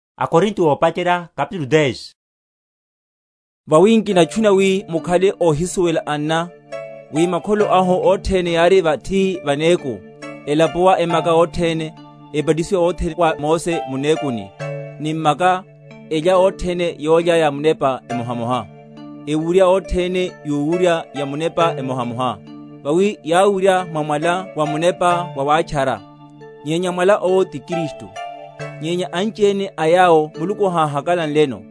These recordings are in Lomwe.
Nihimwéhe Muluku mwaíni, ntoko Israyeli. Vawi nkinatchuna, wi mukhale óhisuwela, anna, wi makholo ahu othene yári vathi va neku, elapuwa emaka othene; ebatisiwa othene wa Mose, mu nekuni, ni m’maka, elya othene yólya ya munepa emohamoha; ewurya othene yowurya yamunepa emohamoha; vawi yáwurya mwa mwala wamunepa wawátchara; nyenya mwala owo ti Kristu. Nyenya anchiene a yawo Muluku háhakalanleno;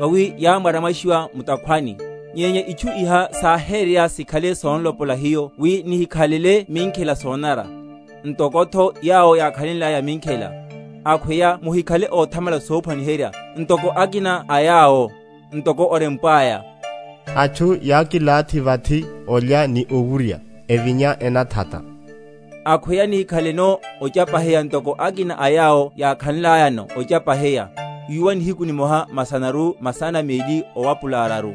vawi yámwaramwashiwa mu’takhwani. Nyenya itchu iha sáhéreya, sikhale son’lopola hiyo wi nihikhalele minkhela sonanara, ntokotho yawo yákhalenlaya minkhela. Akhweya muhikhale óthamala sophwaniherya, ntoko akina a yawo, ntoko orempwaya, Atchu yákilathi vathi olya ni owurya, evinya enathata. Akhweya nihikhaleno ochapaheya ntoko akina a yawo yákhanlayano ochapaheya, yuwa nihiku nimoha masanaru masana meli owapula araru.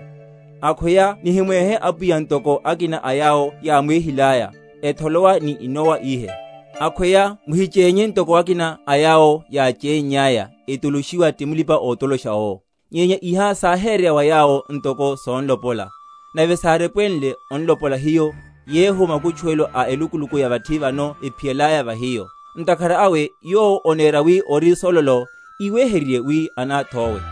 Akhweya nihiwéhe Apwiya, ntoko akina a yawo yáwéhilaya, etholowa ni inowa ihe. Akhweya muhichénye, ntoko akina a yawo yáchénnyaya, etoloshiwa ti mulipa‐otolosha owo. Nyenya iha sáhéreya wa yawo ntoko son’lopola, nave sárepwenle on’lopola hiyo, yehu makutchuwelo a elukuluku ya vathi vano ephiyalaya va hiyo. Ntakhara awe yowo onera wi ori sololo, íweherye wi anáthowe.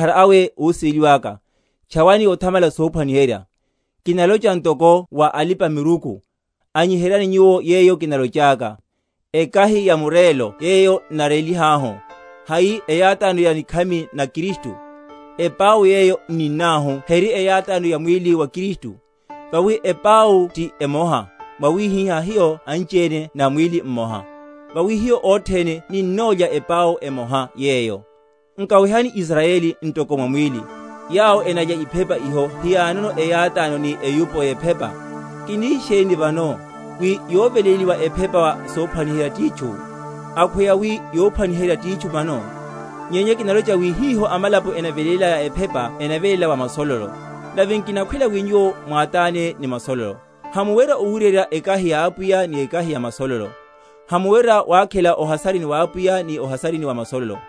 Ntakhara awe, ósiveliwáka, tchawani othamala sophwaniherya. Kinalocha ntoko wa alipa‐miruku; anyiheryani nyuwo yeyo kinalochaka. Ekahi ya murélo yeyo n’narélihahu, hai eyátáno ya nikhami na Kristu? Epau yeyo n’ninnahu heri eyátáno ya mwíli wa Kristu? Vawi epau ti emoha, mwawihihá hiyo anchiene na mwíli mmoha; vawi hiyo othene ninnolya epau emoha yeyo. Nkawehani Israyeli ntoko mwa mwíli; yawo enalya iphepa iho hiyanono eyátáno ni eyupo yephepa? Kini sheni vano? wi yoveléliwa ephepa wa sophwaniherya titchu? Akhweya wi yophwaniherya titchu mano? Nyenya kinalocha wi hiho amalapo enavelélaya ephepa enaveléla wa masololo; nave nkinakhwela wi nyuwo mwátáne ni masololo. Hamuwerya owuryerya ekahi ya Apwiya, ni ekahi ya masololo; hamuwerya wakhela o’hasarini wa Apwiya, ni o’hasarini wa masololo.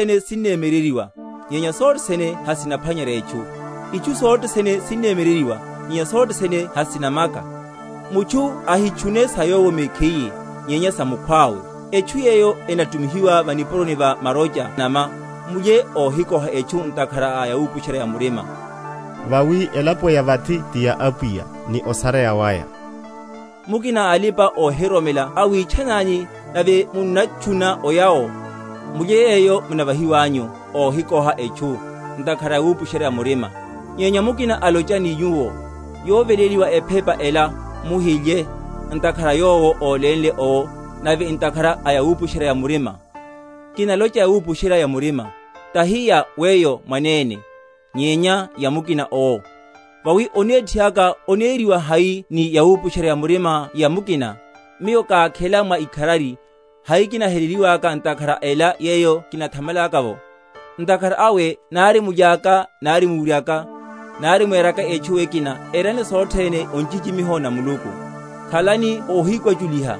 Itchu sothe sene sinnemyeryeryiwa; nyenya sothe sene hasinaphwanyerya etchu. Itchu sothe sene sinnemyeryeryiwa; nyenya sothe sene hasinamaka. Mutchu ahitchune sa yowo mekhiye, nyenya sa mukhwawe. Etchu yeyo enatumihiwa va’puroni va marocha na’nama, mulye, óhikoha etchu ntakhara a yawupusherya‐ya‐murima; vawi elapo ya vathi ti ya Apwiya, ni osareya waya. Mukina a alipa‐ohiroromela awitchanani, nave munnatchuna oya’wo; mulye yeyo munavahiwanyu, óhikoha etchu, ntakhara a wupusherya‐ya‐murima. Nyenya mukina alocha ni nyuwo, Yoveléliwa ephepa ela, muhilye, ntakhara a yowo ólénle owo, nave ntakhara a yawupusherya‐ya‐murima. Kinalocha yawupusherya‐ya‐murima, tahi ya weyo mwanene, nyenya ya mukina owo; vawi onethi aka oneriwa hai ni yawupusherya‐ya‐murima ya mukina? Miyo kákhela mwa ikharari, hai kinaheleliwaka ntakhara a ela yeyo kinathamalaka’vo? Ntakhara awe nari mulyaka, nari muwuryaka, nari mweraka etchu ekina, erani sothene o nchichimiho na Muluku. Khalani óhikwachuliha,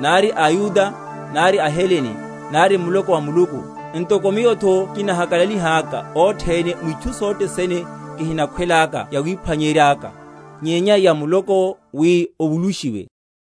nari aYuda, nari aHelene, nari muloko wa Muluku; ntoko miyotho kinahakalalihaka othene mwitchu sothe sene, kihinakhwela yawiphwanyeryaka, nyenya ya muloko’wo, wi ovulushiwe.